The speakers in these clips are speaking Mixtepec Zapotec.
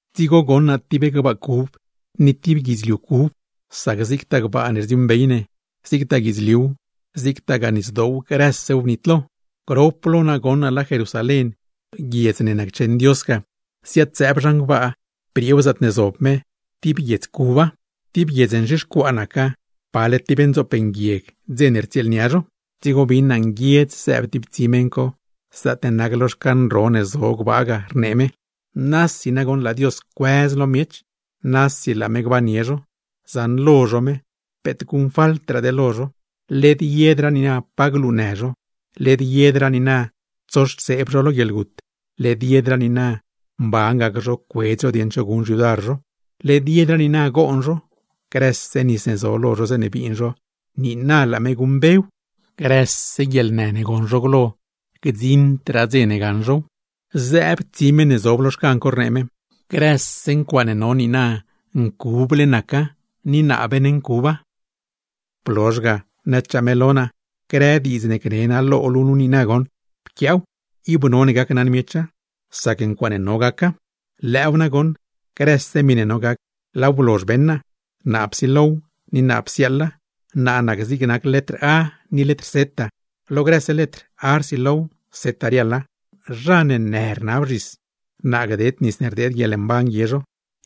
Dzigo goṉ naa tib gbaa cub, ni tib guidzliu cub; sac zigtaa gbaa ne rdziuuṉbey ne, zigtaa guidzliuw, zigtagaa nisdoow grësew bnitlo. Grop lo naa goṉ naa laa Jerusalén, guiedz ne naccheṉ Dios ga, ziad-zëëb zhan gbaa brieew zaatne zob me; tib guiedz cuba. Tib guiedz nzhixcuaa naca, pale tib ndzoop nguieg dze ne rtsieelnia zho. Dzigo bin naa nguiedz zëëb tib tsi meṉ co zaatne nac lo xcan ro ne zo gbaa ga, rnee me: ―Nasi nagoṉ laa Dios cuëz lo miech, nasi laa me gbannie zho; zaṉlo zho me, peet guṉfaltraade lo zho. Led yedraa niina pa glunë zho, led yedraa niina tsoxtseeb zho lo guieḻgut, led yedraa niina mban gac zho cuedz zho dieṉ cho guṉ xyudar zho, led yedraa niina goon zho; grëse nis ne zo lo zho zeeṉe biin zho, niina laa me guṉmbew. Grëse ncuaaṉ co, gdziṉdraa dze gaṉ zhow. Zëëb tsi meṉ ne zob lo xcan co, rnee me: ―Grëse ncuaaṉe no niina ncuble naca, ni naa beeṉncuba. Blozh ga, nëchaa me lo naa: ―Grëse diidz ne gni naa lo luu nu niina goṉ, pquiaaw, ib none gacnaṉ miecha, sac ncuaaṉe no gaca. ¡Lëëw nagoṉ, grëse miṉe no gac, laaw blozh beṉ naa! ¡Naa psilow, ni naa psiaaḻa, naa nac zigne nac letr “a” ni letr “z” lo grëse letr, “a” rsilow “z” riaḻa! ’¡Zha ne në rnab zhis, naa gded nis ne rdeed guieḻmban guie zho,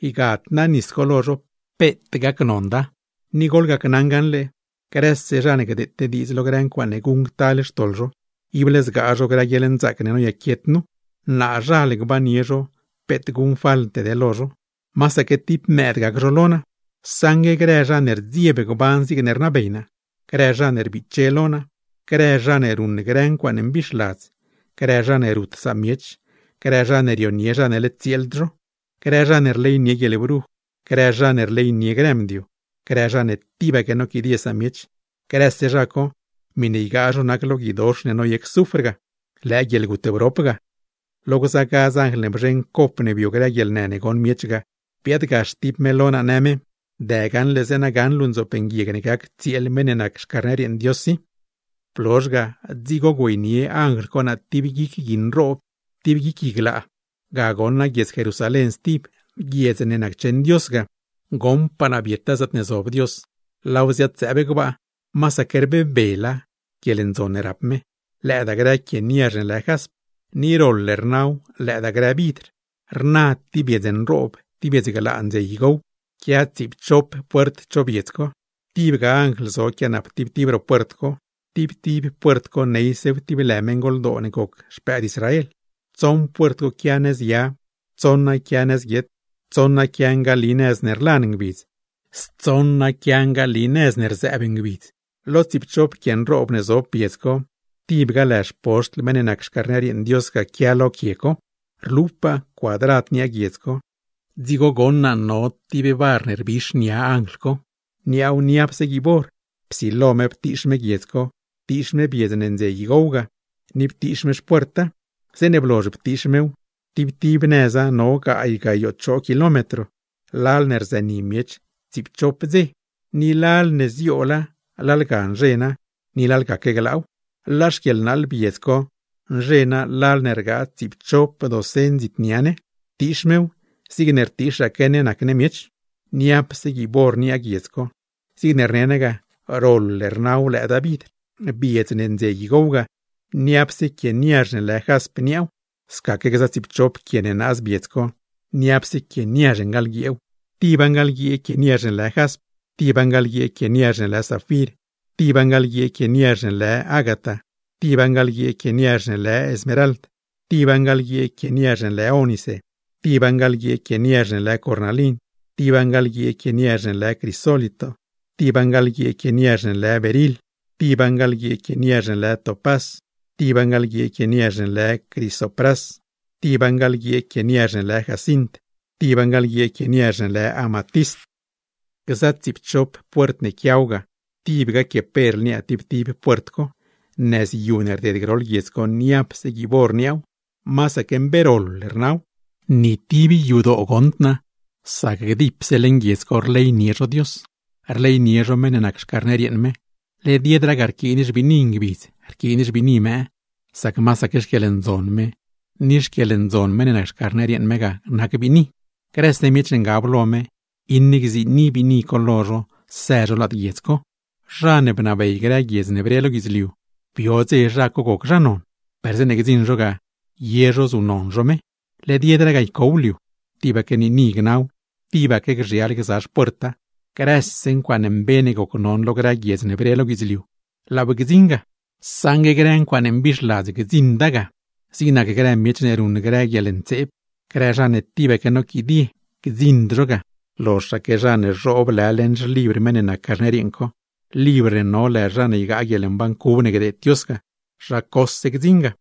ygad naa nis co lo zho, peet gacnonda! Ni goḻgacnaṉ gaṉle, grëse zha ne gdeete diidz lo grë ncuaaṉe guṉctal xtoḻ zho, ible zgaa zho grë guieḻnzaac ne noyaquiet nu, naazhal gbannie zho peet guṉfalte lo zho, masaque tib mëëd gac zho lo naa. Saṉgue grë zha ne rdzieb gban zigne rnabey naa, grë zha ne rbiche lo naa, grë zha ne ruṉ grë ncuaaṉ mbixladz, grë zha ne rut samiech, grë zha ne rionie zha ne led tsieeld zho, grë zha ne rleynie guieḻbruj, grë zha ne rleynie grë mdio, grë zha ne tibaque noquidie samiech, grëse zha co miṉe ygaa zho nac lo guidox ne noyec zufr ga; lëë guieḻgut brop ga. Lo gza gadz anjl ne bzheṉ cop ne bio grë guieḻnë ne goṉ miech ga, biaadgax tib me lo naa në me: ―Dë gaṉle zeeṉa gaṉ luu ndzoop nguieg ne gac tsieel meṉ ne nac Xcarner yeeṉ Dios i. Blozh ga, dzigo güeynie anjl co naa tib guic gui nroob, tib guic gui glaa, ga goṉ naa guiedz Jerusalén stib, guiedz ne naccheṉ Dios ga, goṉpaa naa bieta zaatne zob Dios, laaw ziad-zëëb gbaa. Masaque rbebela guieḻndzon ne rap me, lëëdaa grë quie niazh ne lë jasp, ni roḻ rnaw lëëdaa grë vidr. Rna tib biedz nroob, tib biedz glaa ndze igow, quia tsiipchop puert cho biedz co, tibga anjl zo quianap tib tib ro puert co, tib tib puert co neysew tib lë meṉgoldoo ne goc xpëëd Israel. Tsoṉ puert co quia nëz ya, tsoṉa quia nëz guiet, tsoṉa quia ngali nëz ne rlan ngbidz, stsoṉa quia ngali nëz ne rzëëb ngbidz. Lo tsiipchop quie nroob ne zob biedz co, tibga lë xpoxtl meṉ ne nac Xcarner yeeṉ Dios ga quia lo co. Rlupaa cuadrad niaa guiedz co; dzigo goṉ naa no tib bar ne rbix nia anjl co, niaaw niapse guiib or, psilo me ptiix me guiedz co, ptiix me biedz ne ndze igow ga, ni ptiix me xpuerta. Zeeṉe blozh ptiix mew, tib tib nëza no gaay gayoo choo kilómetro, lal ne rzëni miech tsiipchop ngbidz; lal ne zioola lalga nzhena, ni lalgaque glaaw; laa xquieḻnaaḻ biedz co nzhena lal ne rgaa tsiipchop docen dzit nia ne; ptiix mew zigne rtiixaque ne nac ne miech. Niapse guiib or niaa guiedz co, zigne rne naa ga, roḻ rnaw lëëdaa vidr. Biedz ne ndze igow ga, niapse quie niazh ne lë jasp niaaw; scaque gza tsiipchop quie ne naaz biedz co, niapse quie niazh ngaḻguieew: tiba ngaḻguiee quie niazh ne lë jasp, tiba ngaḻguiee quie niazh ne lë zafir, tiba ngaḻguiee quie niazh ne lë ágata, tiba ngaḻguiee quie niazh ne lë smerald, tiba ngaḻguiee quie niazh ne lë ónice, tiba ngaḻguiee quie niazh ne lë cornalin, tiba ngaḻguiee quie niazh ne lë crisólito, tiba ngaḻguiee quie niazh ne lë beril, tiba ngaḻguiee quie niazh ne lë topás, tiba ngaḻguiee quie niazh ne lë crisoprás, tiba ngaḻguiee quie niazh ne lë jacint, tiba ngaḻguiee quie niazh ne lë amatist. Gza tsiipchop puert ne quiaw ga, tibga quie perl niaa tib tib puert co; nëzyu ne rded groḻ guiedz co, niapse guiib or niaaw, masaque mbe roḻ rnaw. Ni tib yadoo goṉd naa, sac dipse lad guiedz co rleynie zho Dios, rleynie zho meṉ ne nac Xcarner yeeṉ me. Led yedraa ga rquiin xbiini ngbidz, rquiin xbiini mëë, sac masaque xquieḻndzon me, ni xquieḻndzon meṉ ne nac Xcarner yeeṉ me ga nac biini. Grëse miech ne ngab lo me, iṉe gziini biini co lo zho së zho lad guiedz co; zha ne bnabey grë guiedz ne bre lo guidzliu, bio dze zha goc zha non, per zeeṉe gdziṉ zho ga ye zho zuṉnon zho me. Led yedraa ga ycow liu, tibaque niini gnaw, tibaque gzhial gza xpuerta. Grëse ncuaaṉe mbe ne gocnon lo grë guiedz ne bre lo guidzliu, laaw gdziṉ ga; saṉgue grë ncuaaṉe mbixladz gdziṉda ga. Zig nac grë miech ne ruṉ grë guieḻntseeb, grë zha ne tibaque noquidie, gdziṉd zhow; loxaque zha ne zhoob lë leṉ xlibr meṉ ne nac Carner yeeṉ co (libr ne no lë zha ne ygaa guieḻmban cub ne gdeed Dios ga), zha cose gdziṉa.